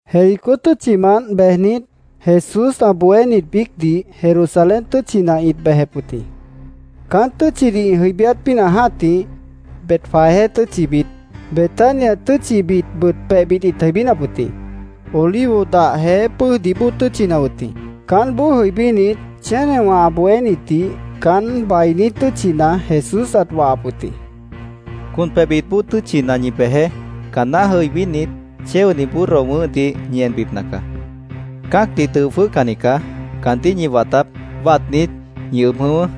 Jericó tʉ́tchimant bejnit, Jesús ã bohénit biícdih Jerusalén tʉ́tchina ĩt bejep wʉt jĩ. Caán tʉ́tchidih ĩ jʉibíát pínah jã́tih, Betfagé tʉ́tchibit, Betania tʉ́tchibitbʉt pebhbit ĩt jʉibínap wʉt jĩ. Olivo dah jeé pʉ́ʉjdih bóo tʉ́tchina wʉt jĩ. Caánboó jʉibínit, chénewã ã bohénitdih caán bainí tʉ́tchina Jesús ãt wahap wʉt jĩ. —Con pebhbit bóo tʉ́tchibitna ñi bejeé. Caanná jʉibínit, chéoni burro wʉ̃ʉ́hdih ñi enbipna caá. Cã́acdih dʉo jwʉ́hcanni caá. Caandíh ñi wataáp. Watnit, ñi ʉb jʉ̃ʉ́wʉ́.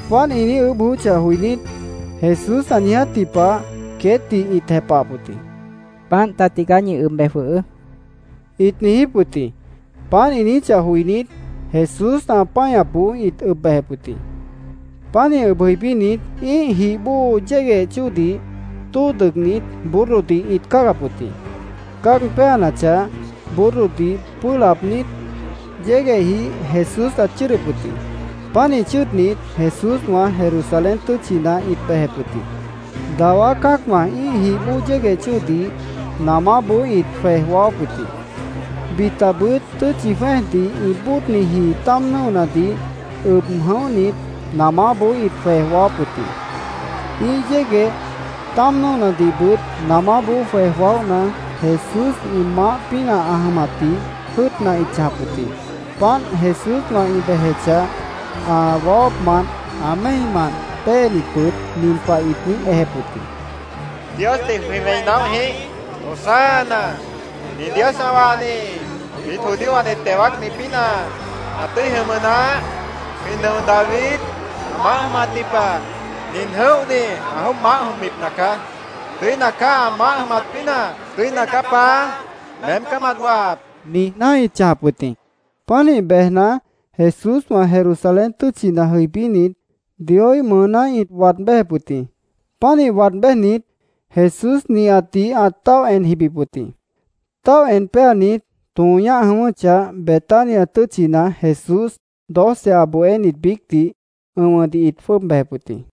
Páant ĩ niíj ʉʉ́bh joyóchah joinít, Jesús ã niijátji pah queétdih ĩt jepahap wʉt jĩ. —Páant ta tigaá. Ñi ʉb bej jwʉhʉʉ́, ĩt niijíp wʉt jĩ. Páant ĩ niijíchah joinít, Jesús ã páñapboó ĩt ʉb bejep wʉt jĩ. Pánih ʉb jʉibínit, ĩ́ih jih bóo yégueh chóodih tóo dʉgnit, burrodih ĩt cáagap wʉt jĩ. Cáag péanachah, burrodih pʉ́ʉh laabnít, yéguehjih Jesús ãt chʉ́ʉdʉp wʉt jĩ. Pánih chʉ́ʉdnit, Jesúswã Jerusalén tʉ́tchina ĩt bejep wʉt jĩ. Dawá cã́acwã ĩ́ih jih bóo yégueh chóodih namáboó ĩt jwej waáwáp wʉt jĩ. Bitabʉt tʉ́tchi jwẽ́ejdih ĩ bóodniji táam nʉ́onadih ʉb jʉ̃óhnit, namáboó ĩt jwej waáwáp wʉt jĩ. Ĩ́ih yégueh, táam nʉ́onadihbʉt namáboó jwej waóhna, Jesús ĩ maáh pínah ã jʉmatdih jʉ́ʉtna ĩt chãjap wʉt jĩ. Páant Jesúswã ĩ bejechah, ã waáwápmant, ã méimant péenitbʉt nin pah ĩt niíj ejep wʉt jĩ: —¡Diosdih jwĩ wẽi naóh jĩíh! ¡Hosana, nin Dios ã wahni jwiít judíowãdih teo wáacni pínah ã tʉ́i jʉmʉ naáh! Jwĩ nʉo David ã maáh jʉmatji pah nin jʉ̃óhni ã jwʉ́ʉb maáh jʉmbipna caá. ¡Tʉ́ina caá ã maáh jʉmat pínah! ¡Tʉ́ina caá, Paá! ¡Meém caá mat wahap! niijná ĩt chãjap wʉt jĩ. Pánih bejna, Jesúswã Jerusalén tʉ́tchina jʉibínit, Dioíh mʉʉná ĩt waad béjep wʉt jĩ. Pánih waad béjnit, Jesús nihatdih ãt táoh en jibip wʉt jĩ. Táoh en péanit, tõo ñáh jʉ̃ʉ́wʉ́chah, Betania tʉ́tchina Jesús doce ã bohénit biícdih ʉ̃wʉdih ĩt jwʉ́ʉb bejep wʉt jĩ.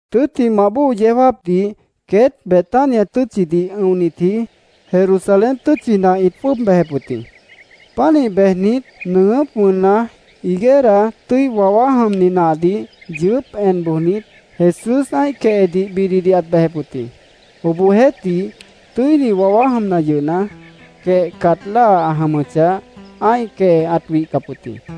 Tʉ́ttimah bóo yeó jáapdih queét Betania tʉ́tchidih ʉ̃onitji Jerusalén tʉ́tchina ĩt jwʉ́ʉb bejep wʉt jĩ. Pánih bejnit, nʉʉgʉ́p wʉnna, higuera tʉ́i wawá jʉmni nahdih yʉʉ́p en bojnit, Jesús ã́ih quehedih bididih ãt bejep wʉt jĩ. Obohjeéhtih, tʉ́ini wawá jʉmna yʉhna, quehcat láa ã jʉmʉchah, ã́ih quehe ãt wihcap wʉt jĩ.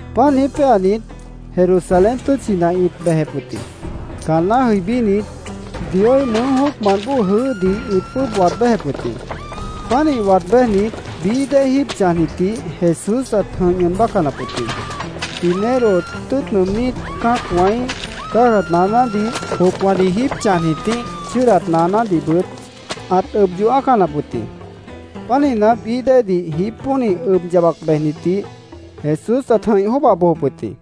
Páant niíj péanit, Jerusalén tʉ́tchina ĩt bejep wʉt jĩ. Caanná jʉibínit, Dioíh mʉʉ́ jóocmant bóo jʉʉ́hdih ĩt jwʉ́ʉb waad béjep wʉt jĩ. Pánih waad béjnit, bií dée jíib chãjnitdih Jesús ãt jʉ̃ih ñʉʉn bácanap wʉt jĩ. Dinero tʉ́ʉt nʉʉmnít cã́acwãíh cáagat naanádih, jopwãdih jíib chãjnitíh chʉ́ʉdat naanádihbʉt ãt ʉb yoh ã́acanap wʉt jĩ. Pánihna, bií déedih jípónih ʉb yabac bejnitdih Jesús ãt jʉ̃ih jwʉ́ʉba bojop wʉt jĩ.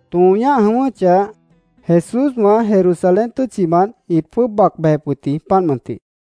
Tõo ñáh jʉ̃ʉ́wʉ́chah, Jesúswã Jerusalén tʉ́tchimant ĩt jwʉ́ʉb bac bejep wʉt jĩ, páant mʉntih.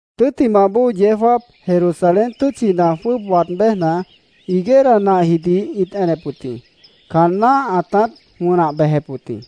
Tʉ́ttimah bóo yeó jáap, Jerusalén tʉ́tchina jwʉ́ʉb aab béjna, higuera nahjidih ĩt enep wʉt jĩ. Caan náh ãtát wʉnah bejep wʉt jĩ.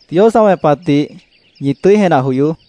—Dios ã wẽpatdih ñi tʉ́i jenah joyoó.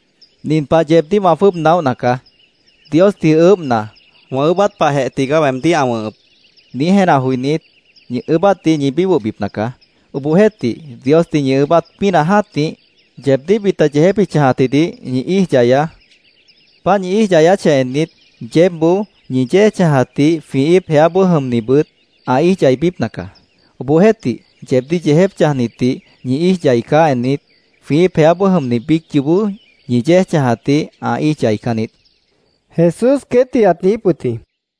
Nin pah yeebdíh wã jwʉ́ʉb naóhna caá. Diosdih ʉʉ́bhna, ‘Wã ʉʉ́bát pahjeh tigaá weemdíh ã wʉ̃hʉp’, niíj jenah joinít, ñi ʉʉ́bátdih ñi bíbohbipna caá. Obohjeéhtih, Diosdih ñi ʉʉ́bát pínah jã́tih, yeebdíh bita yeejép ĩ chãjatjidih ñi íij yayaá. Páant ñi íij yayáchah ennit, yeébboó ñi yéej chãjatdih jwĩ íip jeáboó jʉmnibʉt ã íij yaibípna caá. Obohjeéhtih, yeebdíh yeejép chãjnitdih ñi íij yaicáh ennit, jwĩ íip jeáboó jʉmni biíc yoobó ñi yéej chãjatdih ã íij yaicán niít, Jesús queétdih ãt niijíp wʉt jĩ.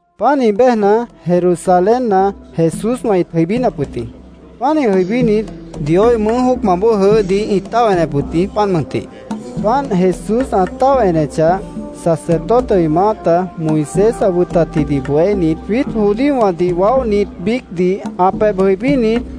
Páant niij béjna, Jerusalénna Jesúswã ĩt jʉibínap wʉt jĩ. Pánih jʉibínit, Dioíh mʉʉ́ jóocmant bóo jʉʉ́hdih ĩt táoh enep wʉt jĩ, páant mʉntih. Páant Jesús ã táoh enechah, sacerdotewã ĩ maáta, Moisés ã wʉtatjidih bohénit, jwiít judíowãdih waóhnit biícdih ã pebh jʉibínit,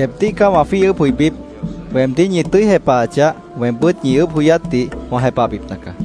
—Yeebdíh caá wã jwíih ʉʉ́bh joibíp. Weemdíh ñi tʉ́i jepahachah, weembʉ́t ñi ʉʉ́bh joyátdih wã jepahbipna caá.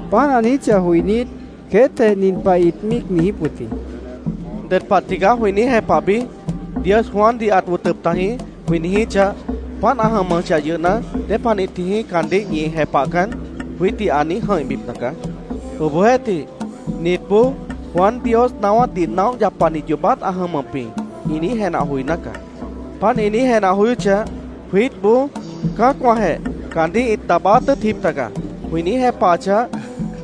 Páant ã niijíchah joinít, queétjeh nin pah ĩt míic niijíp wʉt jĩ: “¿Ded pah tigaá jwĩ niíj jepahbi? ‘Dios Juandih ãt wʉtʉp tajĩ’, jwĩ niijíchah, ‘Páant ã jʉmʉchah yʉhna, ¿dépanih tijĩí caandíh ñi jepahcan?’ jwiítdih ã niíj jʉ̃ihbipna caá. Obohjeéhtih, nitboó ‘Juan Dios naáwátdih naóh yapani yoobát ã jʉmʉp jĩ’, ĩ niíj jenah joiná caá. Páant ĩ niíj jenah joyóchah, jwiítboó ‘Cã́acwãjeh caandíh ĩt daabáát tʉ́ʉtjip taga’, jwĩ niíj jepahachah,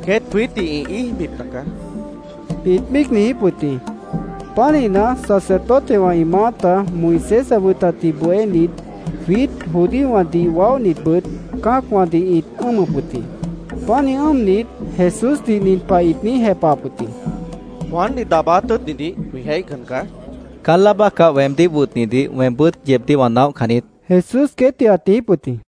queét jwiítdih ĩ íijbipna caá”, ĩt míic niijíp wʉt jĩ. Pánihna, sacerdotewã ĩ maáta, Moisés ã wʉtatjidih bohénit, jwiít judíowãdih waóhnitbʉt cã́acwãdih ĩt ʉ́ʉmʉp wʉt jĩ. Pánih ʉ́ʉmnit, Jesúsdih nin pah ĩt niíj jepahap wʉt jĩ: —Juandih daabáát tʉ́ʉtnidih jwĩ jéihcan caá, ĩt niijíp wʉt jĩ. —Caán láa bácah weemdíh wʉtnidih weembʉ́t yeebdíh wã naóhcan niít, Jesús queétdih ãt niijíp wʉt jĩ.